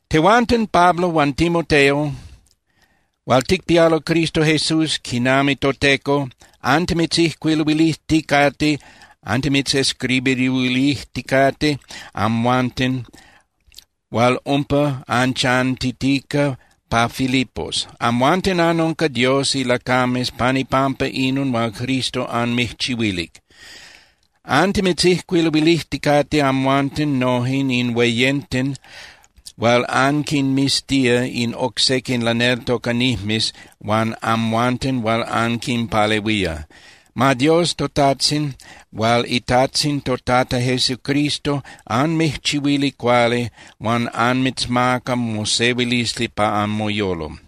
Tehuanten Pablo huan Timoteo hual ticpialo Cristo Jesús quinami toTeco antimitzijcuiluilijticate (antimitzescribiruilijticate) amhuanten hual umpa anchantitica pa Filipos. Amhuanten anunca Dios ilacames pan ipampa inon hual Cristo anmijchihuilic. Antimitzijcuiluilijticate amhuanten noje in hueyenten hual anquinmiztía in oc sequin laneltocanijmes huan amhuanten hual anquinpalehuía. Ma Dios toTajtzin hual iTajtzin toTata Jesucristo anmijchihuili cuali huan ma anmitzmaca mosehuilisli pa anmoyolo.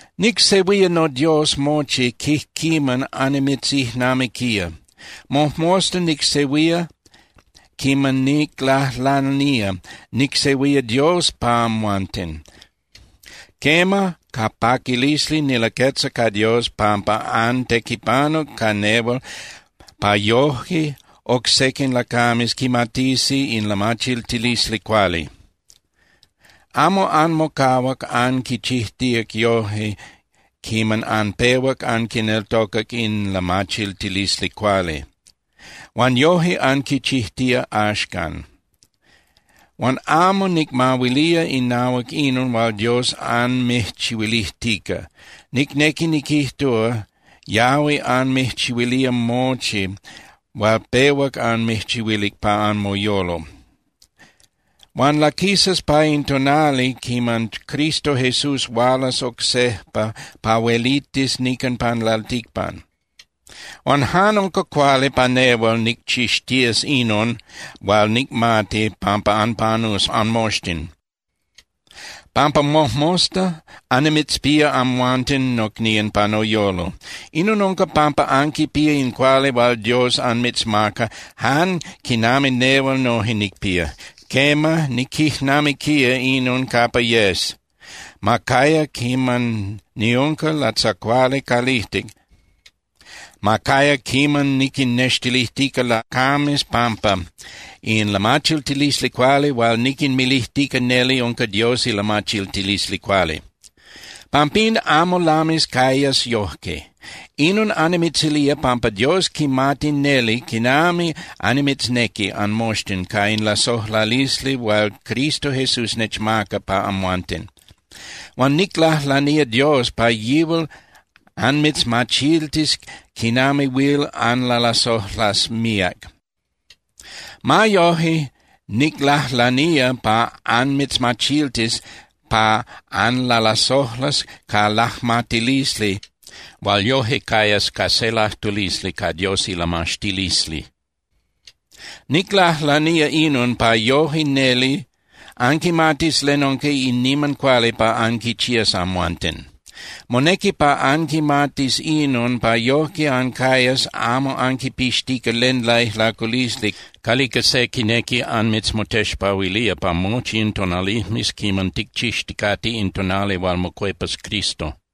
Nicsehuía noDios mochi quijquiman annimitzijnamiquía. Mojmosta nicsehuía quiman niclajlanía, nicsehuía Dios pa amhuanten. Quema, ca paquilisli nilaquetza ca Dios pampa antequipanuc ca nehual pa yoje oc sequin lacames quimatisi in lamachiltilisli cuali. Amo anmocahuac anquichijtíac yojque quiman anpehuac anquineltocac in lamachiltilisli cuali. Huan yoje anquichijtía axcan. Huan amo nicmahuilía inahuac inon hual Dios anmijchihuilijtica. Nicnequi niquijtúa, yahui anmijchihuilía mochi hual pehuac anmijchihuilic pa anmoyolo. Huan laquisas pa in tonali quiman Cristo Jesús hualas oc sejpa pa huelitis nican pan lalticpan. Huan jan unca cuali pa nehual nicchixtías inon hual nicmati pampa anpanus anmoxtin, pampa mojmosta annimitzpía amhuanten nocnían pa noyolo. Inon unca pampa anquipía in cuali hual Dios anmitzmaca jan quinami nehual noje nicpía. Quema, niquijnamiquía inon capa yes, ma caya quiman niunca latzacuali calijtic, ma caya quiman niquinnextilijtica lacames pampa in lamachiltilisli cuali hual niquinmilijtica neli unca Dios ilamachiltilisli cuali. Pampín amo lamis cayas yojque. Inon annimitzilía pampa Dios quimati neli quinami annimitznequi anmoxtin ca in lasojlalisli hual Cristo Jesús nechmaca pa amhuanten. Huan niclajlanía Dios pa yihual anmitzmachiltis quinami huil anlalasojlas míac. Ma yoje, niclajlanía pa anmitzmachiltis pa anlalasojlas ca lajmatilisli hual yoje cayas ca se lajtulisli ca Dios ilamaxtilisli. Niclajlanía inon pa yoje neli anquimatis len unca in niman cuali pa anquichías amhuanten. Monequi pa anquimatis inon pa yojque ancayas amo anquipixtica len laijlaculisli calica se quinequi anmitzmotexpahuilía pa mochi in tonalijmes quiman ticchixticate in tonali hual mocuepas Cristo.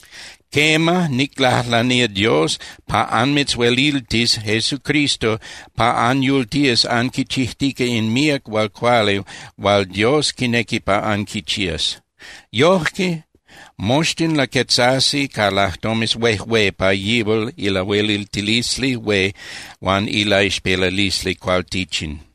Quema, niclajlanía Dios pa anmitzhueliltis Jesucristo pa anyultías anquichijtica in míac hual cuali hual Dios quinequi pa anquichías. Yojque moxtin laquetzasi ca lajtomes huejué pa yihual ilahueliltilisli hué huan ilaixpelalisli cualtichin.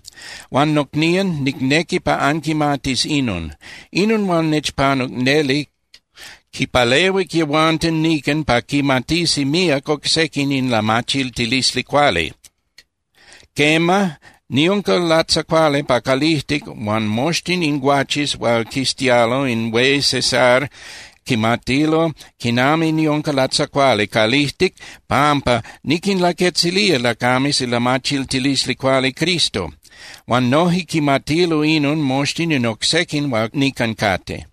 Huan nocnían, nicnequi pa anquimatis inon: Inon hual nechpanuc neli quinpalehuic yehuanten nican pa quimatisi míac oc sequin in lamachiltilisli cuali. Quema, niunca latzacuali pa calijtic huan moxtin in guaches hual quiztialo in hué César quimatilo quinami niunca latzacuali calijtic pampa niquinlaquetzilía lacames ilamachiltilisli cuali Cristo. Huan noje quimatilo inon moxtin in oc sequin hual nican cate.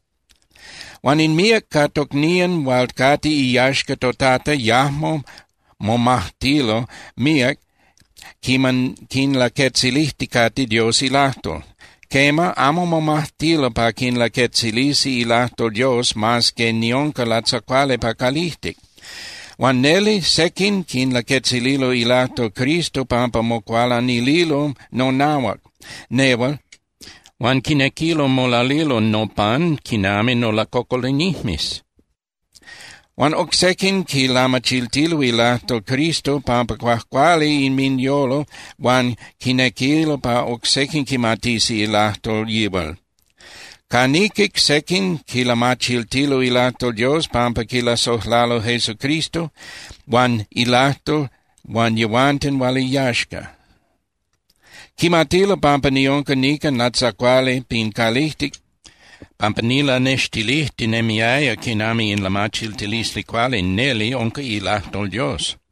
Huan in míac ca tocnían hual cate iyaxca toTata yajmo momajtilo míac quiman quinlaquetzilijticate Dios ilajtol. Quema, amo momajtilo pa quinlaquetzilisi ilajtol Dios mas que niunca latzacuali pa calijtic. Huan neli, sequin quinlaquetzililo ilajtol Cristo pampa mocualanililo nonahuac nehual huan quinequilo molalilo nopan quinami nolacocolinijmes. Huan oc sequin quilamachiltilo ilajtol Cristo pampa cuajcuali inminyolo huan quinequilo pa oc sequin quimatisi ilajtol yihual. Ca niquic, sequin quilamachiltilo ilajtol Dios pampa quilasojlalo Jesucristo huan ilajtol huan yehuanten hual iyaxca. Quimatilo pampa niunca nican latzacuali pin calijtic pampa nilanextilijtinemiaya quinami in lamachiltilisli cuali neli unca ilajtol Dios.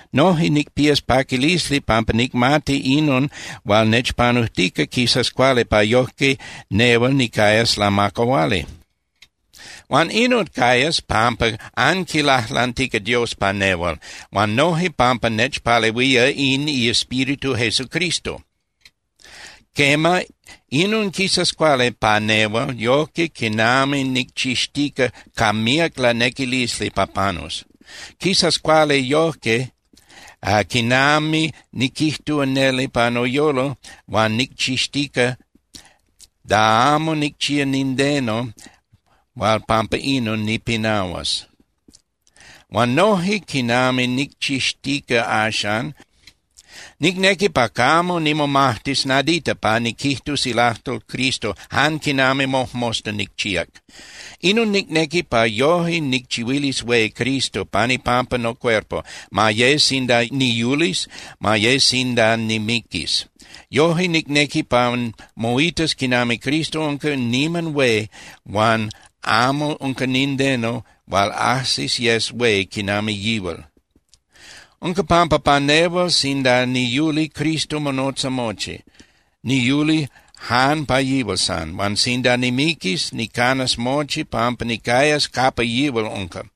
Noje nicpías paquilisli pampa nicmati inon hual nechpanujtica quisas cuali pa yojque nehual nicayas lamacahuali. Huan inon cayas pampa anquilajlantica Dios pa nehual, huan noje pampa nechpalehuía in iEspíritu Jesucristo. Quema, inon quisas cuali pa nehual yojque quinami nicchixtica ca míac lanequilisli pa panus. Quisas cuali yojque quinami niquijtúa neli pa noyolo huan nicchixtica da amo nicchía nindeno hual pampa inon nipinahuas. Huan noje quinami nicchixtica axan, nicnequi pa camo nimomajtis nadita pa niquijtus ilajtol Cristo jan quinami mojmosta nicchíac. Inon nicnequi pa yoje nicchihuilis hué Cristo pan ipampa nocuerpo, ma ye sinda niyulis, ma ye sinda nimiquis. Yoje nicnequi pa moitas quinami Cristo unca niman hué huan amo unca nindeno hual ajsis yes hué quinami yihual. Unca pampa pa nehual sinda niyuli, Cristo monotza mochi, niyuli jan pa yihual san. Huan sinda nimiquis, nicanas mochi pampa nicayas capa yihual unca.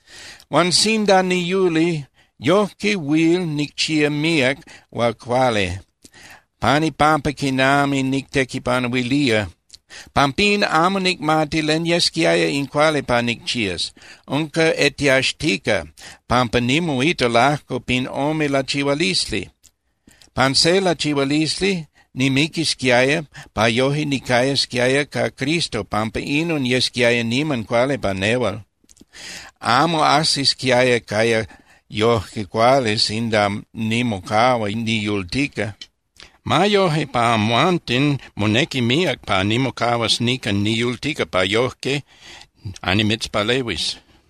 Huan sinda niyuli, yojque huil nicchía míac hual cuali pan ipampa quinami nictequipanuilía. Pampín, amo nicmati len yesquiaya in cuali pa nicchías. Unca etiaxtica, pampa nimoita lajco pin ome lachihualisli. Pan se lachihualisli, nimiquisquiaya pa yoje nicayasquiaya ca Cristo pampa inon yesquiaya niman cuali pa nehual. Amo ajsisquiaya caya yoje cuali sinda nimocahua niyultica. Ma yoje, pa amhuanten, monequi míac pa nimocahuas nican niyultica pa yojque annimitzpalehuis.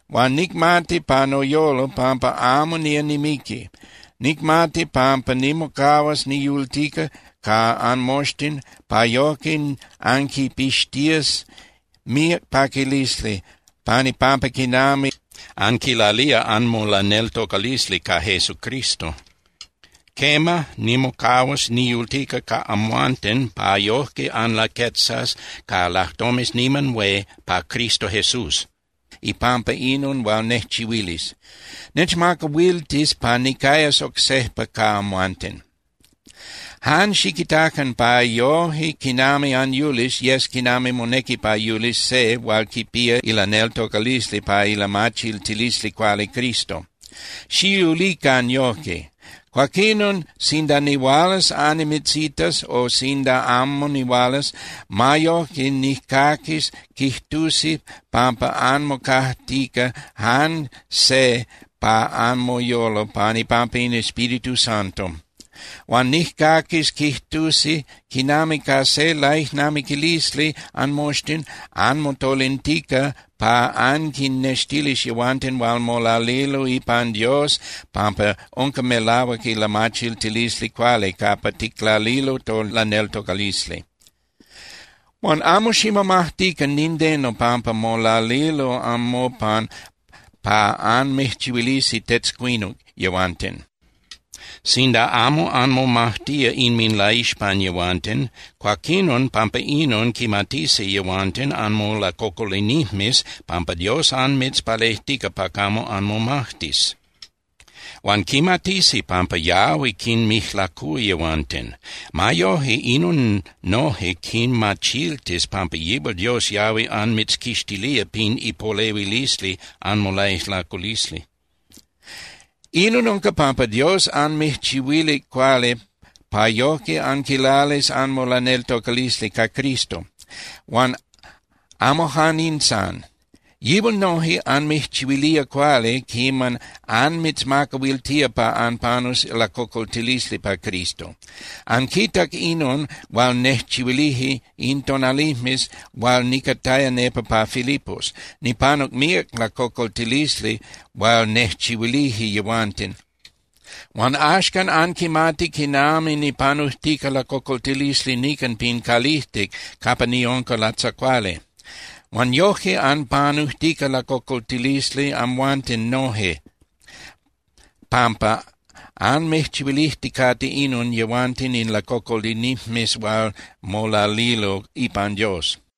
Huan nicmati pa noyolo pampa amo nía nimiqui. Nicmati pampa nimocahuas niyultica ca anmoxtin pa yojque anquipixtías míac paquilisli pan ipampa quinami anquilalía anmolaneltocalisli ca Jesucristo. Quema, nimocahuas niyultica ca amhuanten pa yojque anlaquetzas ca lajtomes niman hué pa Cristo Jesús ipampa inon hual nejchihuilis. Nechmacahuiltis pa nicayas oc sejpa ca amhuanten. Jan xiquitacan pa yoje quinami anyulis yes quinami monequi pa yulis se hual quipía ilaneltocalisli pa ilamachiltilisli cuali Cristo. Xiyulican yojque. Cuaquinon sinda nihualas annimitzitas o sinda amo nihualas, ma yojque nijcaquis quijtusi pampa anmocajtica jan se pa anmoyolo pan ipampa in Espíritu Santo. Huan nijcaquis quijtusi quinami ca se laijnamiquilisli anmoxtin anmotolintica pa anquinnextilis yehuanten hual molalilo ipan Dios pampa unca melahuac ilamachiltilisli cuali capa ticlalilo tolaneltocalisli. Huan amo ximomajtican nindeno pampa molalilo anmopan pa anmijchihuilisi tetzcuinuc yehuanten. Sinda amo anmomajtía inminlaixpan yehuanten, cuaquinon pampa inon quimatisi yehuanten anmolacocolinijmes pampa Dios anmitzpalejtica pa camo anmomajtis. Huan quimatisi pampa yahui quinmijlacúa yehuanten. Ma yoje, inon noje quinmachiltis pampa yihual Dios yahui anmitzquixtilía pin ipolehuilisli anmolaijlaculisli. Inon unca pampa Dios anmijchihuilic cuali pa yojque anquilalis anmolaneltocalisli ca Cristo. Huan amo jan in san. Yihual noje anmijchihuilía cuali quiman anmitzmacahuiltía pa anpanus lacocoltilisli pa Cristo. Anquitac inon hual nejchihuilije in tonalijmes hual nicataya nepa pa Filipos. Nipanuc míac lacocoltilisli hual nejchihuilije yehuanten, huan axcan anquimati quinami nipanujtica lacocoltilisli nican pin calijtic capa niunca latzacuali. Huan yoje anpanujtica lacocoltilisli amhuanten noje pampa anmijchihuilijticate inon yehuanten in lacocolinijmes hual molalilo ipan Dios.